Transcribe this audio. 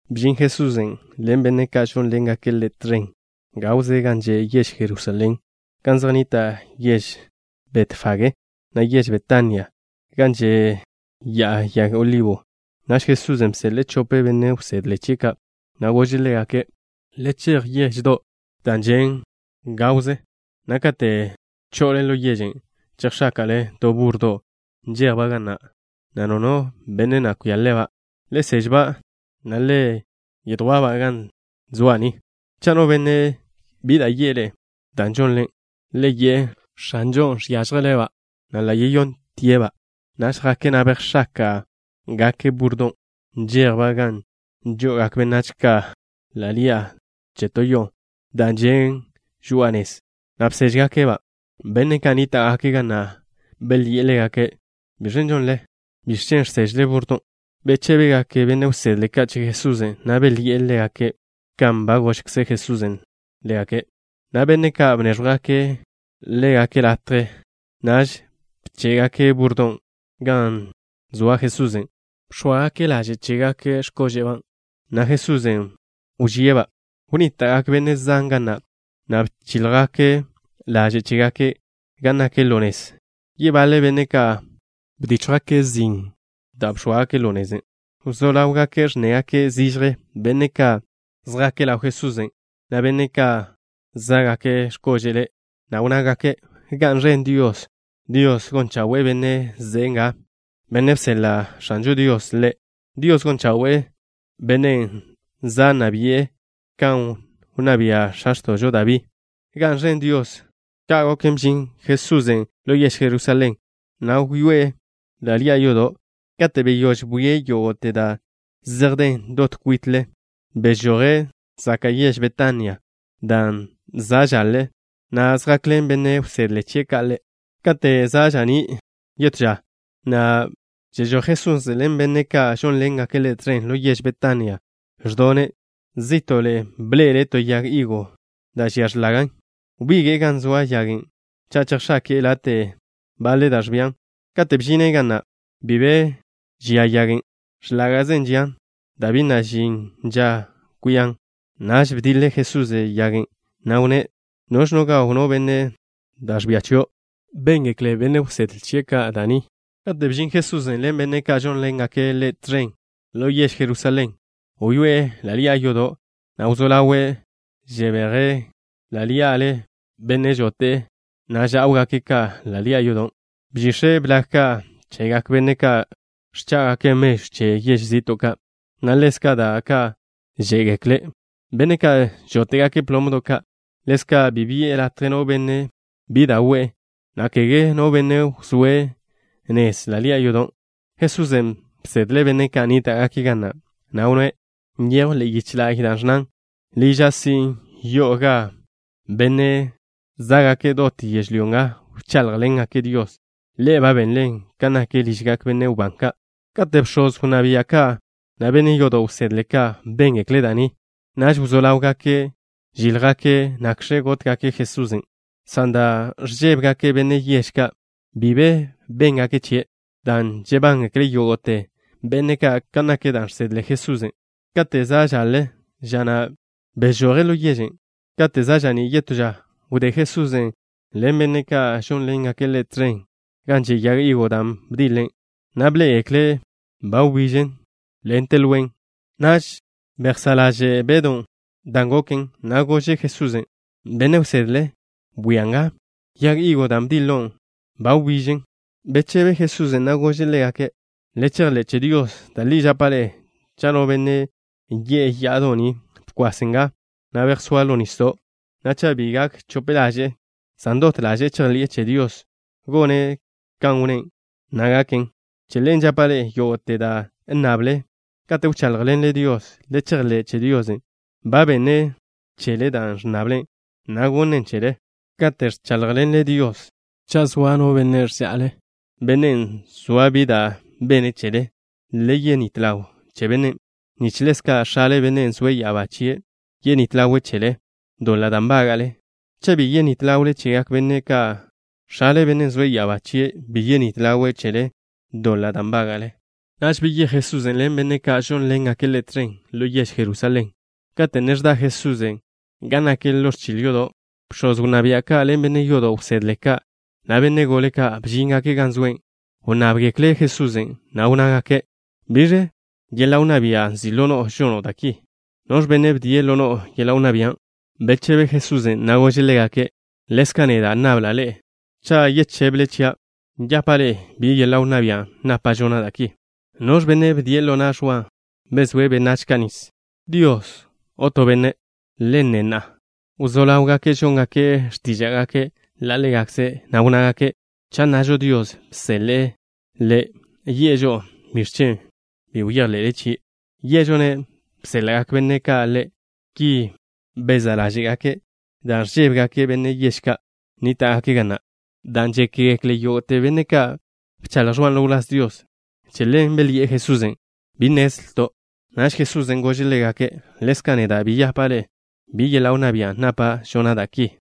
Bžin Jesusen' ḻen benne' ka' žónḻengake' Ḻe' tẕen, gawze gan že' yež Jerusalén, gan zej nnita' yež Betfagé, na' yež Betania, gan že' Ya'a Yag Olibo. Naž Jesusen' bseḻe'e chope benne' wsedle chie' ka', na' gože' ḻégake': —Le chej yeždo' da' žen' ḻawžo, na' kate' cho'ole ḻo yežen', chejx̱áka'le to burrodo' nžejba' ga na', na' bi na' kwia-ba' no benne'. Le sež-ba', na' le yedjwá'-ba' chia'. Cha' no benne' bi da' yi'e ḻe'e dan' žonle ki, le yi'e: “X̱anžon' žénele'-ba', na' ḻa' yeséḻa'tie'-ba' chio'.” Naž jake', na' bejx̱áka'gake' búrrodon', nžejba' gan žo'ogak benách ka' ḻi'a to yo'o da' žen' žoa'a nez, na' bséžgake'-ba'. Benne' ka' nníta'gake' ga na' belyi'e ḻégake': —¿Biẕ da' žonle? ¿Biẕ chen' ẕsežle búrrodon'? Bechébegak benne' wsedle ka' che Jesusen', na' belyi'e ḻégake' kan ba gožkze Jesusen' ḻégake', na' benne' ka' bnéẕjwgake' ḻégake' latje. Naž bché'gake' búrrodon' gan zoa Jesusen'. Bx̱óagake' laže' chégake' x̱kóže'ba', na' Jesusen' wžíe'-ba'. Wnníta'gak benne' zan ga na', na' bchíljgake' laže' chégake' gan nak ḻo nez. Yebaḻe benne' ka' bdíchjgake' zin da' bx̱óagake' ḻo nezen'. Wzó ḻawgak ẕnnegak zižje benne' ka' zjake' ḻaw Jesusen', na' benne' ka' zá'gake' x̱kóže'le', na' wnnágake': —¡Ga'n ẕen Dios! ¡Dios gon chawe'e Benne' ze'e nga, Bennen' bseḻa' X̱anžo Dios Ḻe'! ¡Dios gon chawe'e Bennen' za' nna bi'e kan wnná bia' x̱a x̱to'žo Dabí! ¡Ga'n ẕen Dios! Ka' goken, bžin Jesusen' ḻo yež Jerusalén, na' wyoé'e ḻa' ḻi'a yodo'. Kate' beyóž bwie' yógo'te da' zej den dot kwitle, bežoje' zaka' yež Betania dan' za' žaḻe, na' zjakḻen benne' wsedle chie' ka' Ḻe'. Kate' za' ža'ní' yetó ža, na' zežój Jesusen' ḻen benne' ka' žónḻengake' Ḻe' tẕen, ḻo yež Betania, ẕdone'. Zí'to'le bḻe'ele' to yag higo da' žian x̱lage'. Wbige'e gan zoa yagen' cha' chejx̱ake'e late' da' ẕbian. Kate' bžine' ga na', bi be bejx̱ake'e da' ẕbian. X̱láge'ze žian dan' bi na' žin ža kwian. Naž bdiḻe Jesusen' yagen', na' wnné': —Biž gaw no benne' da' ẕbia chio'. Béngekle benne' wsedle chie' ka' da' ni. Kate' bžin Jesusen' ḻen benne' ka' žónḻengake' Ḻe' tẕen ḻo yež Jerusalén, wyoé'e ḻa' ḻi'a yodo', na' wzó ḻawe' ẕbeje' na'le benne' žote' ža'w ka' ḻa' ḻi'a yodo'. Bžix̱e' blag ka' chegak benne' ka' ẕchá'gake' mežw che yež zi'to' ka', na' ḻezka' da' ka' žé'gekle benne' ka' žóte'gake' plomdo' ka'. Ḻezka' bi bi'e latje no benne' bi da' we'e, na' kege no benne' wzóe' nez ḻa' ḻi'a yodo'. Jesusen' bsedle' benne' ka' nníta'gake' ga na', na' wnné': —Nyejw ḻe'e yiche la'y da' ẕnnan: “Liža' sin', yo'o gan benne' zá'gake' dot yežlyó nga wcháḻjḻengake' Dios.” Ḻe'e ba benlen kan nak ližgak benne' wbán ka'. Kate' bx̱oz wnná bia' ka', na' benne' yodo' wsedle ka' béngekle' da' ni, naž wzó ḻáwgake' žíljgake' nakx̱ gótgake' Jesusen', san dan' ẕžébegake' benne' yež ka', bi be béngake' chie', dan' žebángekle yógo'te benne' ka' kan nak da' žsedle Jesusen'. Kate' za' žaḻe ža na', bežoje' ḻo yežen'. Kate' za' ža'ní' yetó ža, wdé Jesusen' ḻen benne' ka' žónḻengake' Ḻe' tẕen, gan že' yag higo dan' bdiḻe' Ḻe', na' bḻé'egeklen', ba nbižen dot lwen. Naž bezá' ḻaže' Bedw dan' goken, na' gože' Jesusen': —Benne' wsedle, bwia nga. Yag higon' da' bdiḻon' neje, ba nbižen. Bechebe Jesusen', na' gože' ḻégake': —Le chejḻé' che Dios. Da' li žapa' ḻe'e, cha' no benne' yi'e ya'ado' ni: “Bkwas nga, na' bejsóa ḻo nisdo'” na' cha' bi gak chope ḻaže'e, san dot ḻaže'e chejḻi'e che Dios gone' kan wnné', na' gaken. Che ḻen žapa' ḻe'e: yógo'te da' nnable kate' wcháḻjḻenle Dios, le chejḻé' che Dios ba benne' chele dan' ẕnnable, na' gonnen' chele. Katen' ẕcháḻjḻenle Dios, cha' zoa no benne' ẕža'le, bennen' zoa bi da' bene' chele, le yenít ḻaw che bennen', nich ḻezka' X̱ale, Bennen' zoe' ya'abá chie', yenít ḻawe' chele ḻe'e doḻa' da' nbága'le. Cha' bi yenít ḻawle chegak benách ka', X̱ale, Bennen' zoe' ya'abá chie', bi yenít ḻawe' chele ḻe'e doḻa' da' nbága'le. Naž beyéj Jesusen' ḻen benne' ka' žónḻengake' Ḻe' tẕen ḻo yež Jerusalén. Kate' ne ẕda Jesusen' gan nak ḻo ẕchil yodo', bx̱oz wnná bia' ka' ḻen benne' yodo' wsedle ka', na' benne' gole ka', bžíngake' gan zoe'. Wnnábgekle' Jesusen', na' wnnágake': —¿Biẕ yeḻa' wnná bia' nzi' ḻo no'o žono' da' ki? ¿Noẕ benne' bdie' ḻo no'o yeḻa' wnná bian'? Bechebe Jesusen', na' gože' ḻégake': —Ḻezka' neda' nnabla' ḻe'e to. Cha' yechébele chia', yapa' ḻe'e bi yeḻa' wnná bia' napa' žona' da' ki. ¿Noẕ benne' bdie' ḻo na' Ẕwa bezóe' benách ka' nis? ¿Dios o to benne'? Le nne na'a. Wzó ḻáwgake' žóngake' x̱tíža'gake' ḻa' ḻégakze', na' wnnágake': —Cha' nnažo Dios bseḻe'e ḻe', yi'e žo'o: “¿Biẕ chen' bi bejḻe'le chie'?” ¿Yé'ažo-ne', bséḻa'gak benne' ka' ḻe'? Ki bezá' ḻáže'gake' dan' ẕžébegake' benne' yež ka' nníta'gake' ga na', dan' žékgekle yógo'te benne' ka' bchaḻj Ẕwan' ḻo wláz Dios. Che ḻen belyi'e Jesusen': —Bi nnezlto'. Naž Jesusen' gože' ḻégake': —Ḻezka' neda' bi yapa' ḻe'e bi yeḻa' wnná bia' napa' žona' da' ki.